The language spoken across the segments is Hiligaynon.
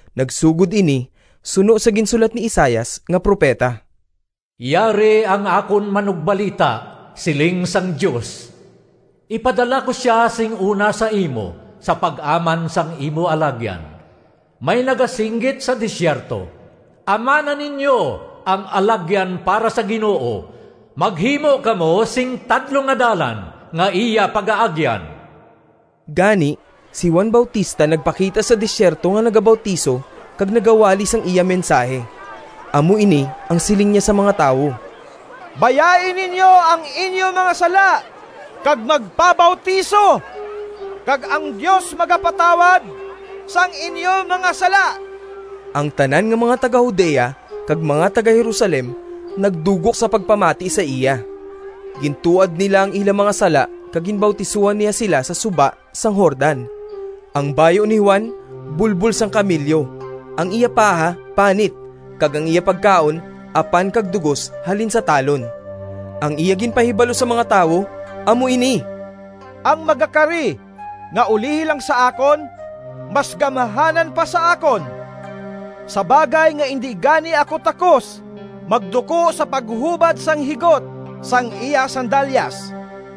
Nagsugod ini suno sa ginsulat ni Isaias nga propeta: “ ‘Yari ang akon manugbalita,’ Siling sang Dios. ‘Ipadala ko sia sing una sa imo Sa pag-aman sang imo alagyan.’ May nagasinggit sa desierto: ‘Amana ninyo ang alagyan Para sa Ginoo, Maghimo kamo sing tadlong nga dalan Nga iya pagaagyan.’” Gani, si Juan Bautista nagpakita sa desierto nga nagabautiso kag nagawali sang iya mensahi. Amo ini ang siling niya sa mga tawo: “Bayai ninyo ang inyo mga sala kag magpabautiso kag ang Dios magapatawad sang inyo mga sala.” Ang tanan nga mga taga-Judea kag mga taga-Jerusalem nagdugok sa pagpamati sa iya. Gintuad nila ang ila mga sala kag ginbautisohan niya sila sa suba sang Jordan. Ang bayu ni Juan bulbol sang kamelyo, ang iya paha panit, kag ang iya pagkaon apan kag dugos halin sa talon. Ang iya ginpahibalo sa mga tawo amo ini: “Ang magakari nga ulihi lang sa akon mas gamhanan pa sa akon, sa bagay nga indi gani ako takos magduko sa paghubad sang higot sang iya sandalyas.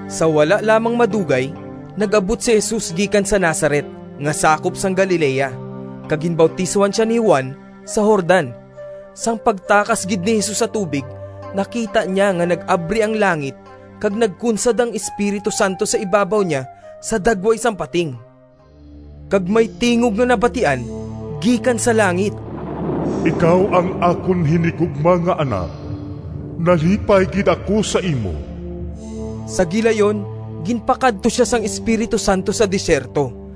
Sa wala lamang madugay, nag-abot si Jesus gikan sa Nazaret nga sakop sang Galilea, kag ginbautisohan sia ni Juan sa Jordan. Sang pagtakas gid ni Jesus sa tubig nakita niya nga nag-abri ang langit kag nagkunsad ang Espiritu Santo sa ibabaw niya sa dagway sang pating. Kag may tingog nga nabatian gikan sa langit: “Ikaw ang akon hinigugma nga Anak. Nalipay gid ako sa imo.” Sa gilayon ginpakadto sia sang Espiritu Santo sa desierto.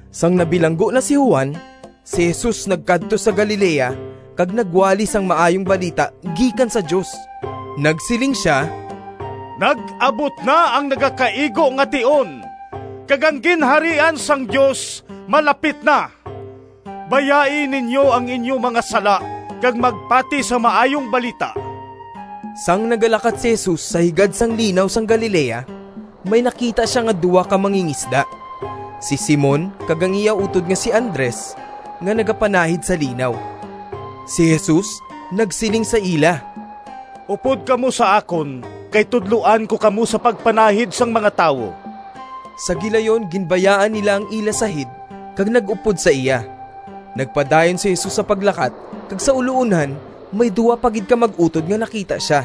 Sang nabilanggo na si Juan, si Jesus nagkadto sa Galilea kag nagwali sang Maayong Balita gikan sa Dios. Nagsiling sia, “Nag-abot na ang nagakaigo nga tion, kag ang Ginharian sang Dios malapit na. Bayai ninyo ang inyo mga sala, kag magpati sa Maayong Balita.” Sang nagalakat si Jesus sa higad sang Linaw sang Galilea, may nakita sia nga duha ka mangingisda, si Simon kag ang iya utod nga si Andres, nga nagapanahid sa linaw. Si Jesus nagsiling sa ila, “Upod kamo sa akon kay tudloan ko kamo sa pagpanahid sang mga tawo.” Sa gilayon ginbayaan nila ang ila sahid kag nag-upod sa iya. Nagpadayon si Jesus sa paglakat kag sa uloonhan may duha pa gid ka mag-utod nga nakita sia,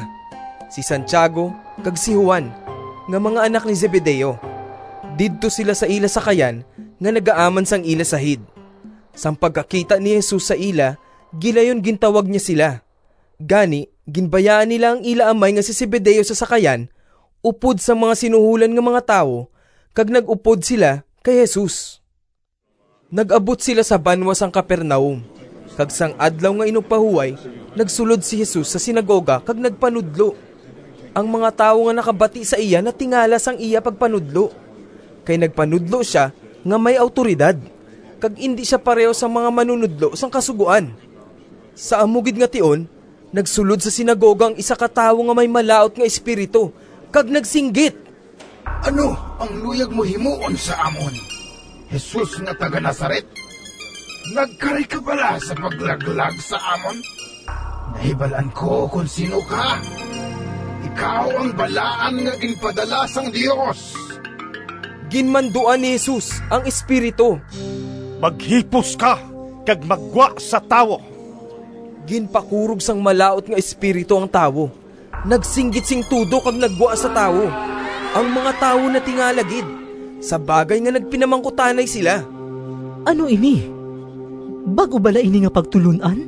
si Santiago kag si Juan, nga mga anak ni Zebedeo. Didto sila sa ila sakayan nga nagaaman sang ila sahid. Sang pagkakita ni Jesus sa ila gilayon gintawag niya sila. Gani, ginbayaan nila ang ila amay nga si Zebedeo sa sakayan upod sang mga sinuholan nga mga tawo kag nag-upod sila kay Jesus. Nag-abot sila sa banwa sang Capernaum, kag sang Adlaw nga Inugpahuway nagsulod si Jesus sa sinagoga kag nagpanudlo. Ang mga tawo nga nakabati sa iya natingala sang iya pagpanudlo kay nagpanudlo sia nga may awtoridad kag indi sia pareho sang mga manunodlo sang Kasugoan. Sa amo gid nga tion nagsulod sa sinagoga ang isa ka tawo nga may malaut nga espiritu kag nagsinggit, “Ano ang luyag mo himuon sa amon, Jesus nga taga-Nazaret? Nagkari ka bala sa paglaglag sa amon? Nahibal-an ko kon sin-o ka. Ikaw ang Balaan nga ginpadala sang Dios!” Ginmanduan ni Jesus ang espiritu: “Maghipos ka kag maggwa sa tawo.” Ginpakurog sang malaut nga espiritu ang tawo, nagsinggit sing tudo kag naggwa sa tawo. Ang mga tawo natingala gid, sa bagay nga nagpinamangkutanay sila, “Ano ini? Bag-o bala ini nga pagtulon-an?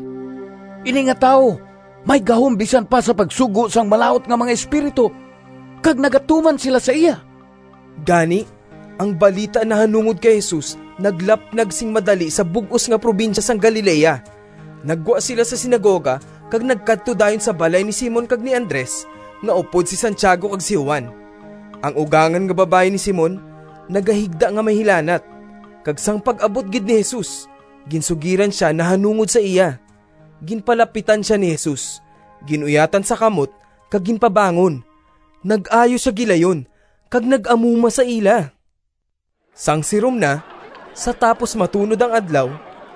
Ini nga tawo may gahom bisan pa sa pagsugo sang malaut nga mga espiritu, kag nagatuman sila sa iya.” Gani, ang balita nahanungod kay Jesus naglapnag sing madali sa bug-os nga probinsya sang Galilea. Naggwa sila sa sinagoga kag nagkadto dayon sa balay ni Simon kag ni Andres nga upod si Santiago kag si Juan. Ang ugangan nga babayi ni Simon nagahigda nga may hilanat, kag sang pag-abot gid ni Jesus ginsugiran sia nahanungod sa iya. Ginpalapitan sia ni Jesus, gin-uyatan sa kamot kag ginpabangon. Nag-ayo sia gilayon kag nag-amuma sa ila. Sang sirom na, sa tapos matunod ang adlaw,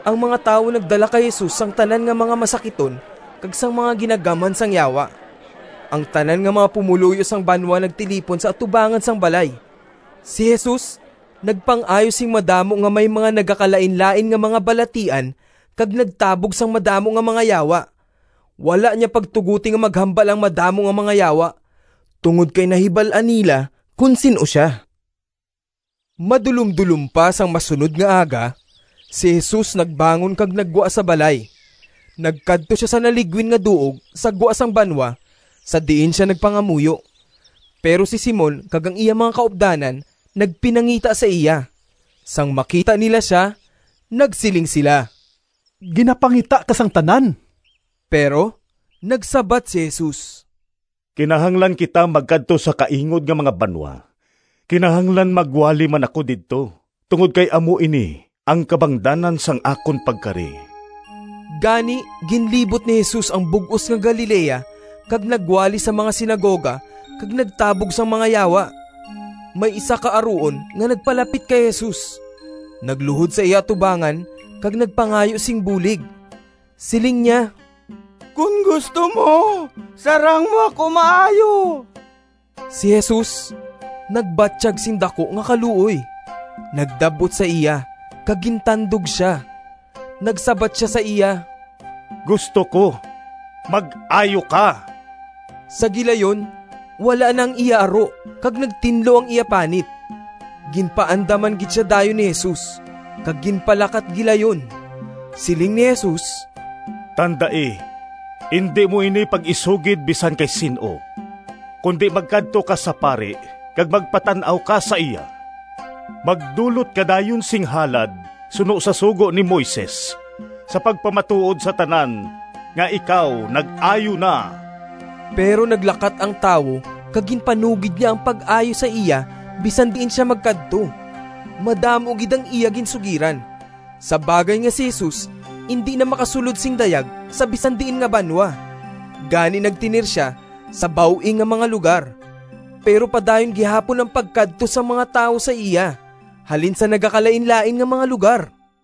ang mga tawo nagdala kay Jesus sang tanan nga mga masakiton kag sang mga ginagamhan sang yawa. Ang tanan nga mga pumoluyo sang banwa nagtilipon sa atubangan sang balay. Si Jesus nagpang-ayo sing madamo nga may mga nagakalainlain nga mga balatian kag nagtabog sang madamo nga mga yawa. Wala niya pagtugoti nga maghambal ang madamo nga mga yawa, tungod kay nahibal-an nila kon sin-o sia. Madulomdulom pa sang masunod nga aga, si Jesus nagbangon kag naggwa sa balay. Nagkadto sia sa naligwin nga duog sa gwa sang banwa sa diin sia nagpangamuyo. Pero si Simon kag ang iya mga kaupdanan nagpinangita sa iya. Sang makita nila sia nagsiling sila, “Ginapangita ka sang tanan.” Pero nagsabat si Jesus: “Kinahanglan kita magkadto sa kaingod nga mga banwa. Kinahanglan magwali man ako didto tungod kay amo ini ang kabangdanan sang akon pagkari.” Gani ginlibot ni Jesus ang bug-os nga Galilea kag nagwali sa mga sinagoga kag nagtabog sang mga yawa. May isa ka aruon nga nagpalapit kay Jesus, nagluhod sa iya atubangan kag nagpangayo sing bulig. Siling niya: “Kon gusto mo, sarang mo ako maayo.” Si Jesus nagbatyag sing daku nga kaluoy, nagdab-ot sa iya, kag gintandog sia. Nagsabat sia sa iya, “Gusto ko! Mag-ayo ka!” Sa gilayon wala na ang iya aro kag nagtinlo ang iya panit. Ginpaandaman gid sia dayon ni Jesus kag ginpalakat gilayon. Siling ni Jesus: “Tandai, indi mo ini pag-isugid bisan kay sin-o kundi magkadto ka sa pari kag magpatan-aw ka sa iya. Magdulot ka dayon sing halad suno sa sugo ni Moises, sa pagpamatuod sa tanan nga ikaw nag-ayo na.” Pero naglakat ang tawo kag ginpanugid niya ang pag-ayo sa iya bisan diin sia magkadto. Madamo gid ang iya ginsugiran, sa bagay nga si Jesus indi na makasulod sing dayag sa bisan diin nga banwa. Gani nagtener sia sa baw-ing nga mga lugar, pero padayon gihapon ang pagkadto sang mga tawo sa iya halin sa nagakalainlain nga mga lugar.